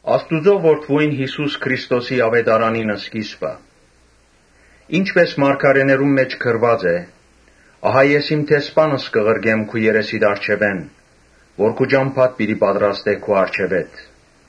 Աստուծոյ Որդիին Յիսուս Քրիստոսի աւետարանին սկիզբը։ Ինչպէս մարգարէներուն մէջ գրուած է. «Ահա ես իմ դեսպանս կը ղրկեմ քու երեսիդ առջեւէն, որ քու ճամբադ պատրաստէ առջեւդ»։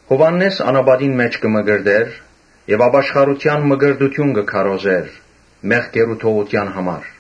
Յովհաննէս անապատին մէջ կը մկրտէր եւ ապաշխարութեան մկրտութիւնը կը քարոզէր՝ մեղքերու թողութեան համար։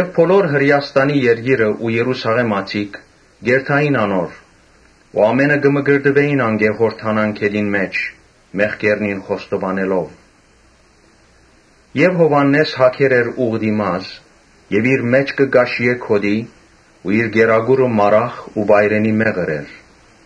Բոլոր Հրէաստանի երկիրը ու Երուսաղէմացիները կ’երթային անոր։ Ամէնքը կը մկրտուէին անկէ Յորդանան գետին մէջ՝ մեղքերնին խոստովանելով։ Յովհաննէս հագեր էր ուղտի մազ եւ իր մէջքը՝ կաշիէ գօտի ու իր կերակուրը մարախ ու վայրենի մեղր էր։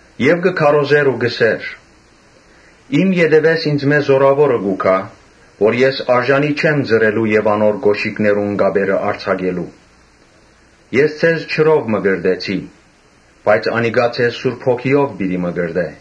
Ան կը քարոզէր ու կ’ըսէր. «Իմ ետեւէս ինծմէ զօրաւորը կու գայ։ Ես արժանի չեմ ծռելու եւ անոր կօշիկներուն կապերը արձակելու։ Ես ձեզ ջրով մկրտեցի, բայց անիկա ձեզ Սուրբ Հոգիով պիտի մկրտէ»։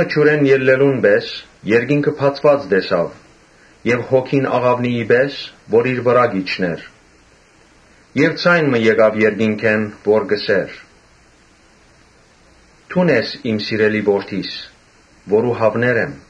Ջուրէն ելլելուն պէս երկինքը բացուած տեսաւ եւ Հոգին աղաւնիի պէս՝ որ իր վրայ կ’իջնէր Եւ ձայն մը եկաւ երկնքէն, որ կ’ըսէր. «Դուն ես իմ սիրելի Որդիս, որուն հաւներ եմ»։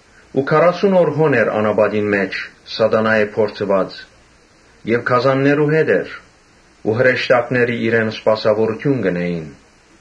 Քառասուն օր հոն էր՝ անապատին մէջ՝ Սատանայէն փորձուած եւ գազաններու հետ էր ու հրեշտակները իրեն սպասաւորութիւն կ’ընէին։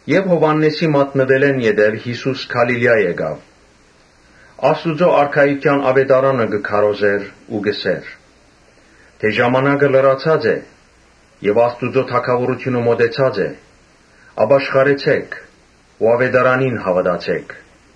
Յովհաննէսին մատնուելէն յետոյ Յիսուս Գալիլիա գալով, Աստուծոյ արքայութեան աւետարանը կը քարոզէր Ու կ’ըսէր. «Ժամանակը լրացած է եւ Աստուծոյ թագաւորութիւնը մօտեցած է. ապաշխարեցէք ու աւետարանին հաւատացէք»։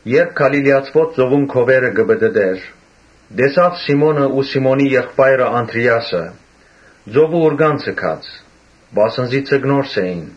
Երբ Գալիլիացիներու ծովուն քովերը կը պտըտէր, տեսաւ Սիմոնը ու Սիմոնին եղբայրը Անդրէասը, ծովը ուռկան ձգած, վասն զի ձկնորս էին։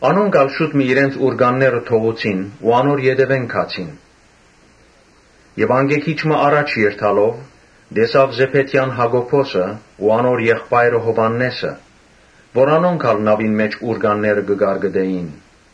Անոնք ալ շուտ մը իրենց ուռկանները թողուցին ու անոր ետեւէն գացին։ Անկէ քիչ մը յառաջ երթալով՝ տեսաւ Զեբեդեան Յակոբոսը ու անոր եղբայրը Յովհաննէսը, որոնք նաւին մէջ ուռկանները կը կարկտնէին։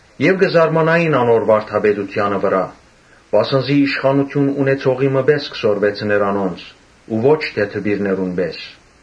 Ամէնքն ալ կը զարմանային անոր վարդապետութեանը վրայ, վասն զի իշխանութիւն ունեցողի մը պէս կը սորվեցնէր անոնց, ոչ թէ դպիրներուն պէս։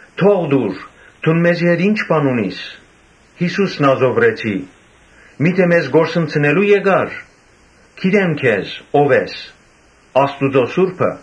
«Թող տուր, դուն մեզի հետ ի՞նչ բան ունիս, Յիսո՛ւս Նազովրեցի. միթէ մեզ կորսնցնելո՞ւ եկար։ Գիտեմ թէ ո՛վ ես՝ Աստուծոյ Սուրբը»։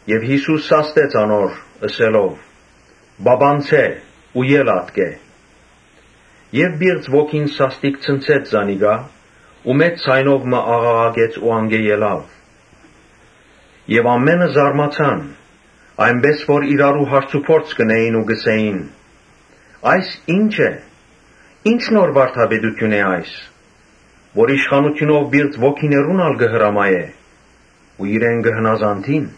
Յիսուս սաստեց՝ ըսելով. «Պապանձէ ու ել ատկէ»։ Պիղծ ոգին սաստիկ ցնցեց զանիկա ու մեծ ձայնով մը աղաղակեց ու անկէ ելաւ։ Ամէնքը զարմացան, այնպէս որ իրարու հարցուփորձ կ’ընէին. «Այս ի՞նչ է, ի՞նչ նոր վարդապետութիւն է այս, որ իշխանութիւնով պիղծ ոգիներուն ալ կը հրամայէ ու իրեն կը հնազանդին»։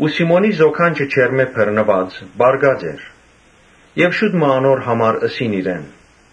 Սիմոնին զոքանչը ջերմէ բռնուած՝ պառկած էր։ Զոքանչին համար ըսին իրեն։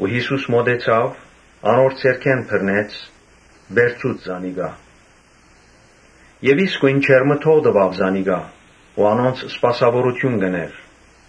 Յիսուս մօտեցաւ, անոր ձեռքէն բռնեց, վերցուց զանիկա եւ իսկոյն ջերմը թողուց զանիկա ու անոնց սպասաւորութիւն կ’ընէր։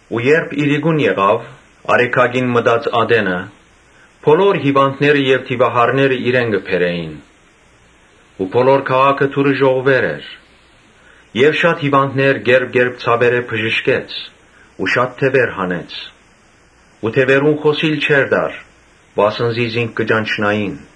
Իրիկունը՝ արեգակին մարը մտած ատենը՝ բոլոր հիւանդները եւ դիւահարները իրեն կը բերէին։ Բոլոր քաղաքը դուռը ժողվուեր էր։ Շատ հիւանդներ՝ կերպ կերպ ցաւերէ՝ բժշկեց ու շատ դեւեր հանեց։ Դեւերուն խօսիլ չէր տար, վասն զի զինք կը ճանչնային։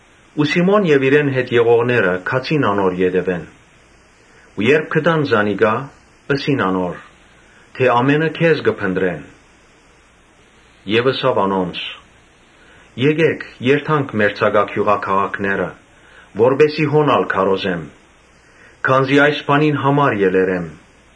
Սիմոն եւ իրեն հետ եղողները գացին անոր ետեւէն։ Երբ գտան զանիկա, ըսին անոր. «Ամէնքը քեզ կը փնտռեն»։ Ան ըսաւ. «Եկէք երթանք մերձակայ գիւղաքաղաքները, որպէս զի հոն ալ քարոզեմ, վասն զի այս բանին համար եկեր եմ»։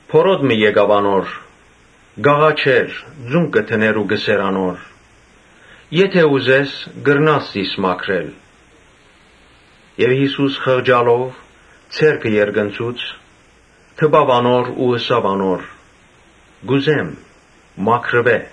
Բորոտ մը եկաւ անոր, կ՛աղաչէր, ծունկ կը դնէր ու կ’ըսէր անոր. «Եթէ ուզես, կրնաս զիս մաքրել»։ Յիսուս խղճալով՝ ձեռքը երկնցուց, դպաւ անոր ու ըսաւ. «Կ’ուզե՛մ, մաքրուէ»։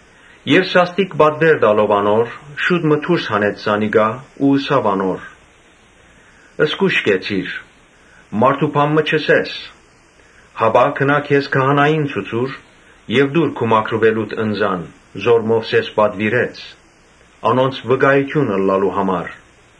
Ինք սաստիկ պատուէր տալով անոր՝ շուտ մը դուրս հանեց զանիկա ու ըսաւ անոր. «Զգո՛յշ կեցիր, մարդո՛ւ բան մը չըսես, հապա գնա քեզ քահանային ցուցուր եւ տուր քու մաքրուելուդ ընծան որ Մովսէս պատուիրեց՝ անոնց վկայութիւն ըլլալու համար»։